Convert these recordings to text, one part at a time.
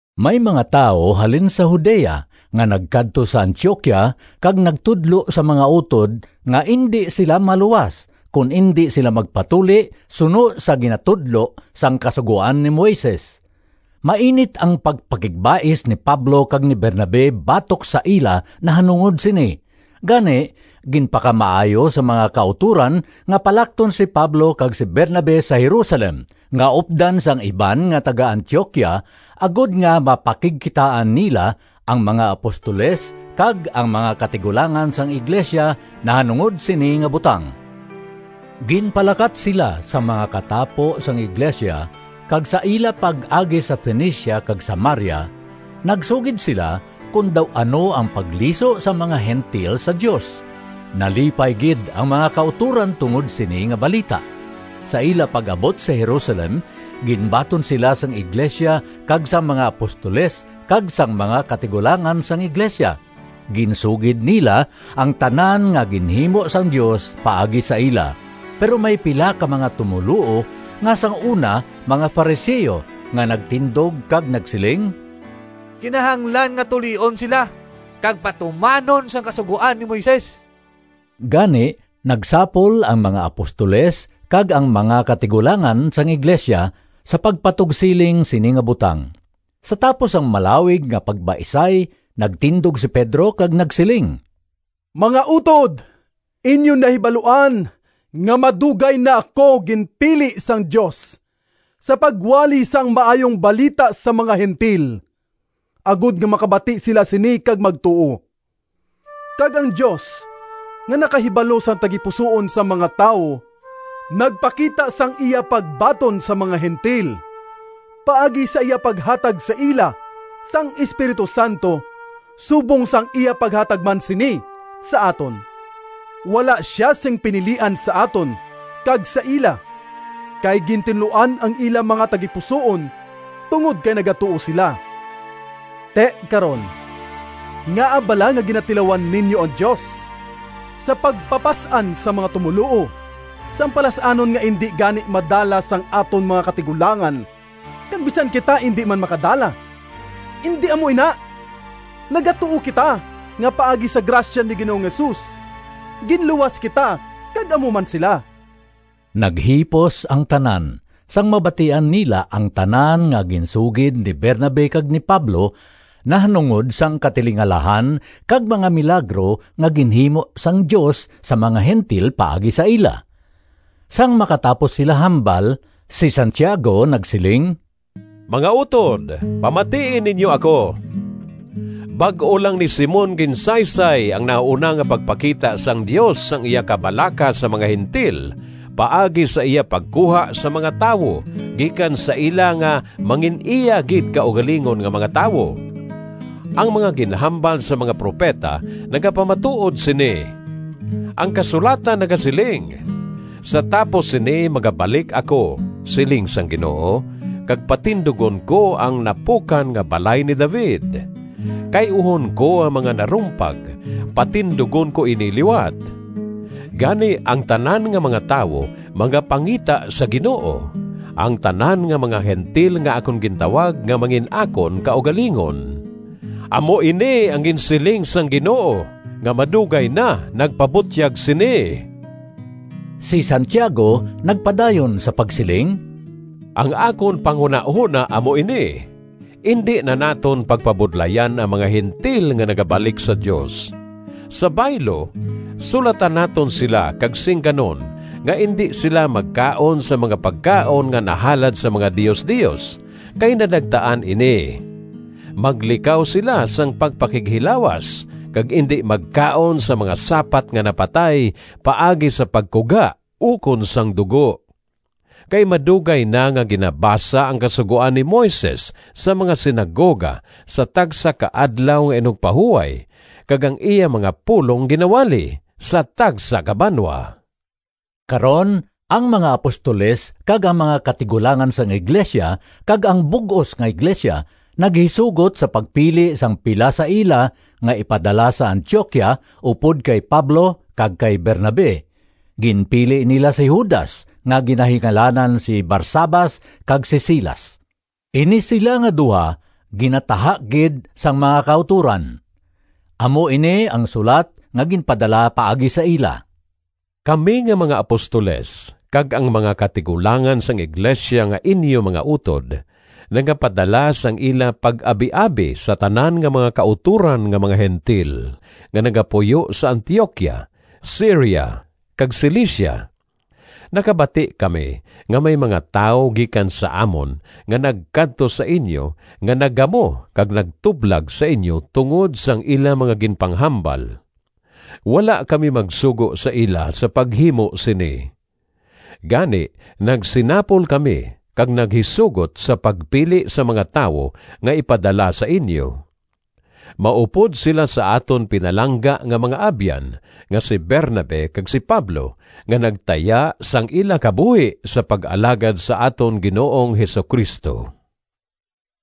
May mga tawo halin sa Judea nga nagkadto sa Antioquia kag nagtudlo sa mga utod nga indi sila maluwas kon indi sila magpatuli, suno sa ginatudlo sang Kasugoan ni Moises. Mainit ang pagpakigbais ni Pablo kag ni Bernabe batok sa ila nahanungod sini, gani ginpakamaayo sang mga kautoran nga palakton si Pablo kag si Bernabe sa Jerusalem nga updan sang iban nga taga-Antioquia, agod nga mapakigkitaan nila ang mga apostoles kag ang mga katigulangan sang iglesia nahanungod sini nga butang. Ginpalakat sila sang mga katapo sang iglesia kag sa ila pag-agi sa Fenicia kag Samaria, nagsugid sila kon daw ano ang pagliso sang mga Gentil sa Dios. Nalipay gid ang mga kautoran tungod sini nga balita. Sa ila pag-abot sa Jerusalem ginbaton sila sang iglesia kag sang mga apostoles kag sang mga katigulangan sang iglesia. Ginsugid nila ang tanan nga ginhimo sang Dios paagi sa ila. Pero may pila ka mga tumoluo nga sang una mga Fariseo nga nagtindog kag nagsiling, “Kinahanglan nga tulion sila kag patumanon sang Kasugoan ni Moises.” Gani nagsapol ang mga apostoles kag ang mga katigulangan sang iglesia sa pagpatugsiling sini nga butang. Sa tapos sang malawig nga pagbaisay nagtindog si Pedro kag nagsiling, “Mga utod, inyo nahibaluan nga madugay na ako ginpili sang Dios sa pagwali sang Maayong Balita sa mga Gentil, agod nga makabati sila sini kag magtuo. Kag ang Dios nga nakahibalo sang tagipusoon sang mga tawo nagpakita sang iya pagbaton sa mga Gentil paagi sa iya paghatag sa ila sang Espiritu Santo, subong sang iya paghatag man sini sa aton. Wala sia sing pinilian sa aton kag sa ila, kay gintinluan ang ila mga tagipusoon tungod kay nagatuo sila. Ti, karon, ngaa bala nga ginatilawan ninyo ang Dios sa pagpapas-an sa mga tumoluo sang palas-anon nga indi gani madala sang aton mga katigulangan kag bisan kita indi man makadala? Indi amo ina! Nagatuo kita nga paagi sa grasya ni Ginoong Jesus ginluwas kita kag amo man sila.” Naghipos ang tanan sang mabatian nila ang tanan nga ginsugid ni Bernabe kag ni Pablo nahanungod sang katilingalahan kag mga milagro nga ginhimo sang Dios sa mga Gentil paagi sa ila. Sang makatapos sila hambal, si Santiago nagsiling, “Mga utod, pamatii ninyo ako! Bag-o lang ni Simon ginsaysay ang nahauna nga pagpakita sang Dios sang iya kabalaka sa mga Gentil paagi sa iya pagkuha sang mga tawo gikan sa ila nga mangin-iya gid kaugalingon nga mga tawo. Ang mga ginhambal sang mga propeta nagapamatuod sini. Ang kasulatan nagasiling: ‘Sa tapos sini magabalik ako, Siling sang Ginoo, Kag patindugon ko Ang napukan nga balay ni David, Kay-uhon ko ang mga narumpag Patindugon ko ini liwat. Gani ang tanan nga mga tawo Magapangita sa Ginoo, Ang tanan nga mga Gentil Nga akon gintawag Nga mangin-akon kaugalingon. Amo ini ang ginsiling sang Ginoo Nga madugay na nagpabutyag sini.’” Si Santiago nagpadayon sa pagsiling, “Ang akon panghunahona amo ini: indi na naton pagpabudlayan ang mga Gentil nga nagabalik sa Dios. Sa baylo, sulatan naton sila kag singganon nga indi sila magkaon sang mga pagkaon nga nahalad sa mga diosdios, kay nadagtaan ini; maglikaw sila sang pagpakighilawas, kag indi magkaon sang mga sapat nga napatay paagi sa pagkuga ukon sang dugo. Kay madugay na nga ginabasa ang Kasugoan ni Moises sa mga sinagoga sa tagsa ka Adlaw nga Inugpahuway kag ang iya mga pulong ginawali sa tagsa ka banwa.” Karon ang mga apostoles kag ang mga katigulangan sang iglesia kag ang bug-os nga iglesia, naghisugot sa pagpili sang pila sa ila nga ipadala sa Antioquia upod kay Pablo kag kay Bernabe. Ginpili nila si Judas nga ginahingalanan si Barsabas kag si Silas. Ini sila nga duha ginataha gid sang mga kautoran. Amo ini ang sulat nga ginpadala paagi sa ila: “Kami nga mga apostoles kag ang mga katigulangan sang iglesia, nga inyo mga utod, nagapadala sang ila pag-abiabi sa tanan nga mga kautoran nga mga Gentil nga nagapuyo sa Antioquia, Siria kag Cilicia. Nakabati kami nga may mga tawo gikan sa amon nga nagkadto sa inyo nga naggamo kag nagtublag sa inyo tungod sang ila mga ginpanghambal. Wala kami magsugo sa ila sa paghimo sini. Gani nagsinapol kami kag naghisugot sa pagpili sang mga tawo nga ipadala sa inyo. Maupod sila sa aton pinalangga nga mga abyan nga si Bernabe kag si Pablo nga nagtaya sang ila kabuhi sa pag-alagad sa aton Ginoong Jesu-Cristo.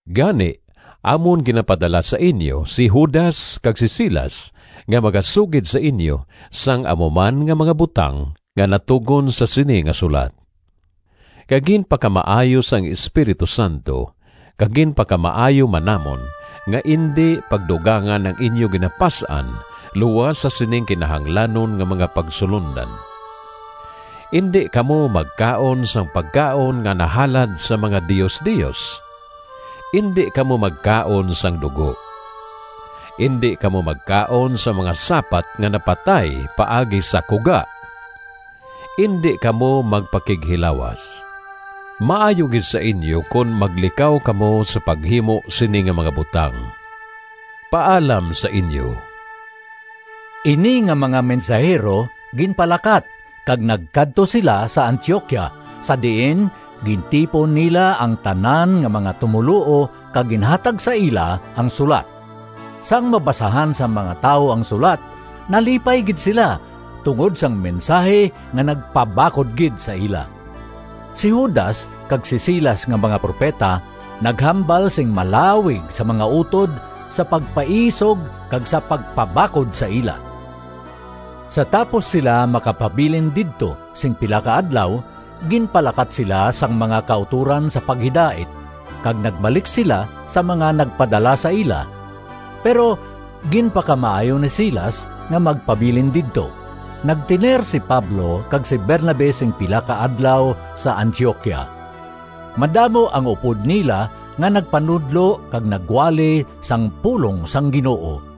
Gani, amon ginapadala sa inyo si Judas kag si Silas nga magasugid sa inyo sang amo man nga mga butang nga natugon sa sini nga sulat. Kay ginpakamaayo sang Espiritu Santo kag ginpakamaayo man namon nga indi pagdugangan ang inyo ginapas-an luas sa sining kinahanglanon nga mga pagsulondan. Indi kamo magkaon sang pagkaon nga nahalad sa mga diosdios. Indi kamo magkaon sang dugo. Indi kamo magkaon sang mga sapat nga napatay paagi sa kuga. Indi kamo magpakighilawas. Maayo gid sa inyo kon maglikaw kamo sa paghimo sini nga mga butang. Paalam sa inyo.” Ini nga mga mensahero ginpalakat kag nagkadto sila sa Antioquia, sa diin gintipon nila ang tanan nga mga tumoluo kag ginhatag sa ila ang sulat. Sang mabasahan sang mga tawo ang sulat, nalipay gid sila tungod sang mensahi nga nagpabakod gid sa ila. Si Judas kag si Silas nga mga propeta, naghambal sing malawig sa mga utod sa pagpaisog kag sa pagpabakod sa ila. Sa tapos sila makapabilin didto sing pila ka adlaw, ginpalakat sila sang mga kautoran sa paghidait, kag nagbalik sila sa mga nagpadala sa ila. [ Pero ginpakamaayo ni Silas nga magpabilin didto.] Nagtener si Pablo kag si Bernabe sing pila ka adlaw sa Antioquia. Madamo ang upod nila nga nagpanudlo kag nagwali sang pulong sang Ginoo.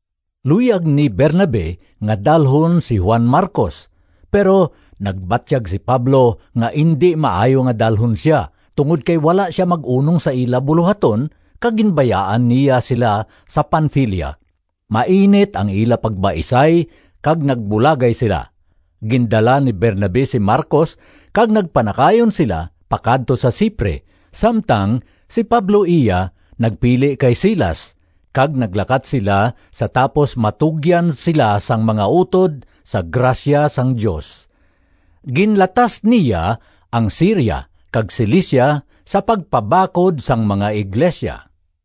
Luyag ni Bernabe nga dalhon si Juan Marcos, pero nagbatyag si Pablo nga indi maayo nga dalhon sia tungod kay wala sia mag-unong sa ila bulohaton kag ginbayaan niya sila sa Panfilia. Mainit ang ila pagbaisay kag nagbulagay sila. Gindala ni Bernabe si Marcos kag nagpanakayon sila pakadto sa Cipre, samtang si Pablo iya nagpili kay Silas kag naglakat sila sa tapos matugyan sila sang mga utod sa grasya sang Dios. Ginlatas niya ang Siria kag Cilicia sa pagpabakod sang mga iglesia.